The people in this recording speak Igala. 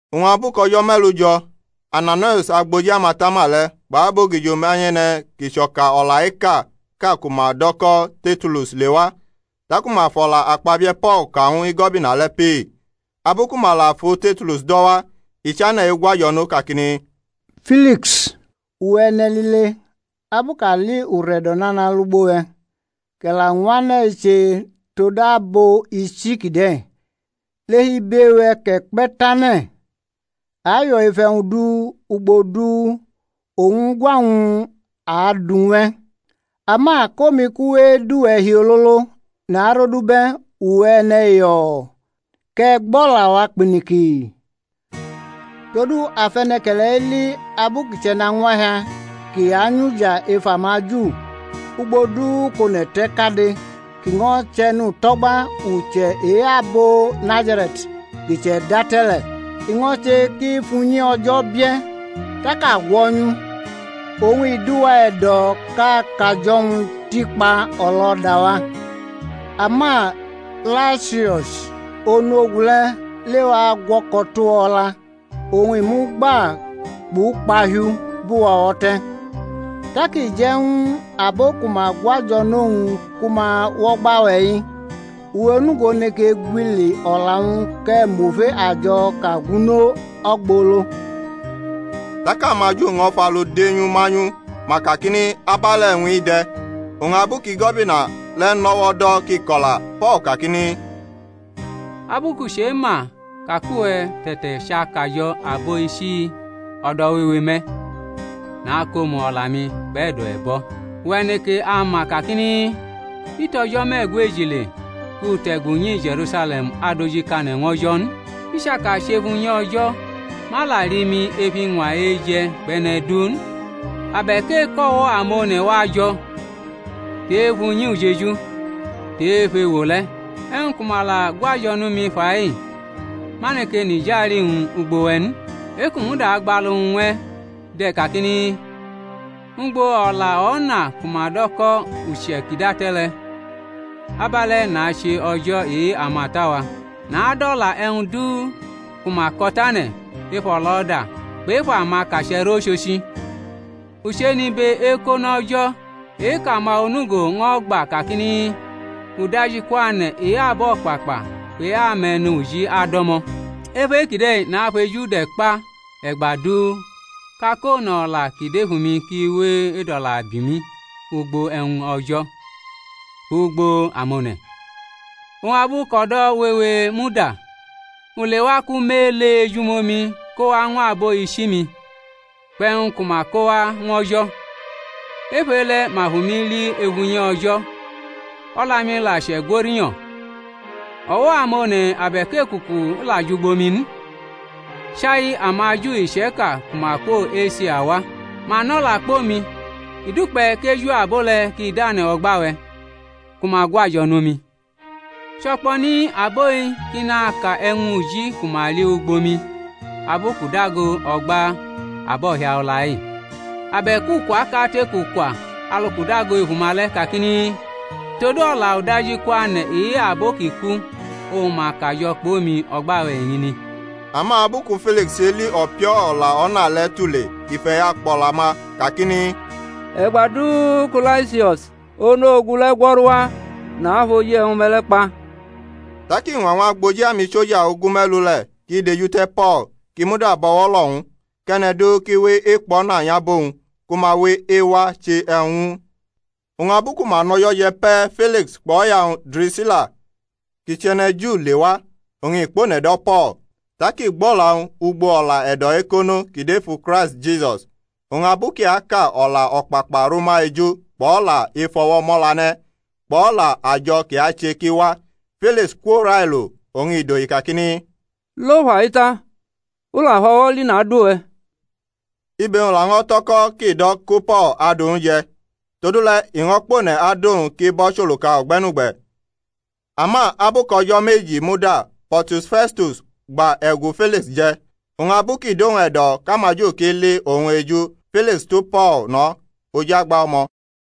Oñ abu kʼo̩jo̩ me̩lu jo̩ Ananaius agboji amatama le̩ kpʼabogijo manyʼe̩ne̩ kʼi chʼo̩ka o̩la ekaʼka ku ma dʼo̩ ko̩ Tertulus lewa, taku ma fʼo̩la akpabie̩ Po̩l ka ñw Igo̩bina le̩ pee. Abu ku ma la fu Tertulus do̩ wa, i chane̩ egwajo̩ nʼo kakini: Filiks, uwe̩ e̩ne̩lile, abu kʼa li ure̩do̩ nana lugbo we̩, kʼe̩ la ñwʼane̩-i che tod abo ichi kide̩, lef ibe-we̩ kʼe̩ kpe̩ tane̩, a yo̩ ef e̩wñ du ugbo du oñ ugwa-wñ a du ñw e̩. Ama kʼomi kʼu we edʼuwe̩ hi ololo, narodubʼe̩, uwe̩ e̩ne̩ yo̩o̩, kʼe̩ gbʼo̩la-wa kpiniki. Todu a fʼe̩ne̩ke̩le̩-i li, abu kʼi chʼe̩nañwahia kʼi anyʼuja ef amaJu ugbo du kʼone̩ te̩ kade, kʼi ño̩ chʼe̩nuto̩gba uche̩ e-abo Nazare̩t ki che̩date̩ le̩. I ño̩ che kʼi fʼunyi O̩jo̩ bie̩, tak a gwo̩nyʼu. [Oñ i dʼuwa e̩do̩ kʼa kajo̩-wñ tikpa o̩lo̩da-wa, ama Laisius, onu ogu le̩, lewa gwo̩ko tʼuwa o̩la, oñ I mʼu gba kpʼukpahiu bʼuwa o̩wo̩ te̩, tak i je̩ ñw abo ku ma gwajo̩ nʼowñ ku ma wʼo̩gba we̩-i.] Uwe̩ onugo neke gwili o̩la-wñ kʼe̩ mʼofe ajo̩ kʼa gwunʼo ogbolo. Tak amaJu ño̩ fʼalu de nyʼu manyʼu, ma kakini, Abe̩le̩ e̩wñ-i de̩. Oñ abu kʼigo̩bina le̩ nʼo̩wo̩ do̩ kʼi ko̩la, Po̩l kakini. Abu kʼu chema ka kʼuwe̩ te̩tachʼakajo̩ abo ichi-i o̩do̩ wewe me̩, nakʼomu o̩la-mi kpʼe̩do̩ e̩bo̩: Uwe̩ neke ama kakini, I tʼo̩jo̩ me̩gweji le kʼu te̩gu nyi Je̩rusale̩m adojikane̩ ñw O̩jo̩ n. I chaka chʼef unyi O̩jo̩, ma la li mi ef iñwa eje̩ kpʼe̩ne̩ du n, abe̩k e̩kʼo̩wo̩ amone̩ wa jo̩, tʼe-ef unyi ujeju, tʼe-ef ewo le̩. E̩wñ ku ma la gwajo̩ nʼumi fa-i ma neke nʼijali-wñ ugbo we̩ n. E-kʼu muda gbalu-wñ ñw e̩ de̩ kakini, Ugbo o̩la O̩na ku ma do̩ ko̩ uche̩ ki che̩date̩ le̩, abe̩le̩ nache O̩jo̩ e-amata-wa, nadʼo̩la e̩wñ du ku ma ko̩tane̩ ef o̩lo̩da kpʼef amakache̩ rʼochochi; u chenʼibe ekono O̩jo̩ e-kʼama onugo ño̩ gba kakini, Uda-iikwane̩ e-abo̩kpakpa kpʼe-ame̩nuji ado̩mo̩. Ef e-kide̩ nafejude̩kpa e̩gba du kʼakone̩ o̩la ki dʼef umi ki we edʼo̩la bi umi ugbo e̩wñ O̩jo̩ kpʼugbo amone̩. Oñ abu kʼo̩do̩ wewe muda, u lewa kʼu mʼele ejumomi kowa ñw abo ichi-mi, kpʼe̩wñ ku ma ko wa ñw O̩jo̩. Ef e-le̩ ma fʼumi li ef unyi O̩jo̩, o̩la-mi la chʼe̩gwo̩ rinyo̩, o̩wo̩ amone̩ abe̩k ekuku la jʼugbo mi n; chai amaJu iche̩ka ku ma kwo Esia wa. Ma nʼo̩la kpʼomi, i dukpe̩ kʼeju abo le̩ ki dane̩ o̩gba-we̩ ku ma gwajo̩ nʼumi; cho̩kpo̩ni abo-i ki naka e̩wñ uji ku ma li ugbo mi abu kʼu dago o̩gba abo̩hiala-i, abe̩k ukomu ukwa kate kʼu kwa alu kʼu dago ef uma le̩ kakini, Todu o̩la udajikwane̩ e-abo ki ku oñ ma kajo̩ kpʼomi o̩gba-we̩ eñini. Ama abu ku Filiks cheli o̩pio̩o̩ o̩la O̩na le̩ tule i fʼe̩ya kpʼo̩la-ma kakini, E̩gba du ku Laisius, onu ogu le̩, gwo̩ru wa nafʼoji e̩wñ-me̩ le̩ kpa. Tak i ñwa ñw agboji amisoja ogume̩lu le̩ kʼi dejute̩ Po̩l kʼi muda bʼo̩wo̩ lo̩ ñw u, kʼe̩ne̩ du ki we̩ ekpo̩na nyʼabo-wñ ku ma we̩ ewa che e̩wñ ñw u n. Oñ abu ku ma nʼo̩jo̩ je̩ pe̩ Filiks kpʼo̩ya-wñ Drisila, kʼi chʼe̩ne̩ Ju, lewa, oñ i kpʼone̩ do̩ Po̩l, tak i gbʼo̩la-wñ ugbo o̩la e̩do̩ ekono ki dʼefu Kraisti Jisus. Oñ abu kʼi aka o̩la o̩kpakpa rʼuma eju kpʼo̩la efʼo̩wo̩ mʼo̩la ne̩ kpʼo̩la ajo̩ ki ache ki wa, Filiks kwo railo, oñ i dohi kakini, Lo fai ta; u la fʼo̩wo̩ li nadʼuwe̩. Ibe-wñ laño̩ tʼo̩ko̩ kʼi do̩ ku Po̩l adu ñw u je̩. Todule̩ i ño̩ kpʼone̩ adʼowñ kʼi bʼo̩ choluka o̩gbe̩nugbe̩. Ama abu kʼo̩do̩ meji muda Po̩rtius Fe̩stus gba e̩gu Filiks je̩; oñ abu ki dʼowñ e̩do̩ kʼamaju ki li owñ eju Filiks tu Po̩l no̩ oj agba o̩mo̩.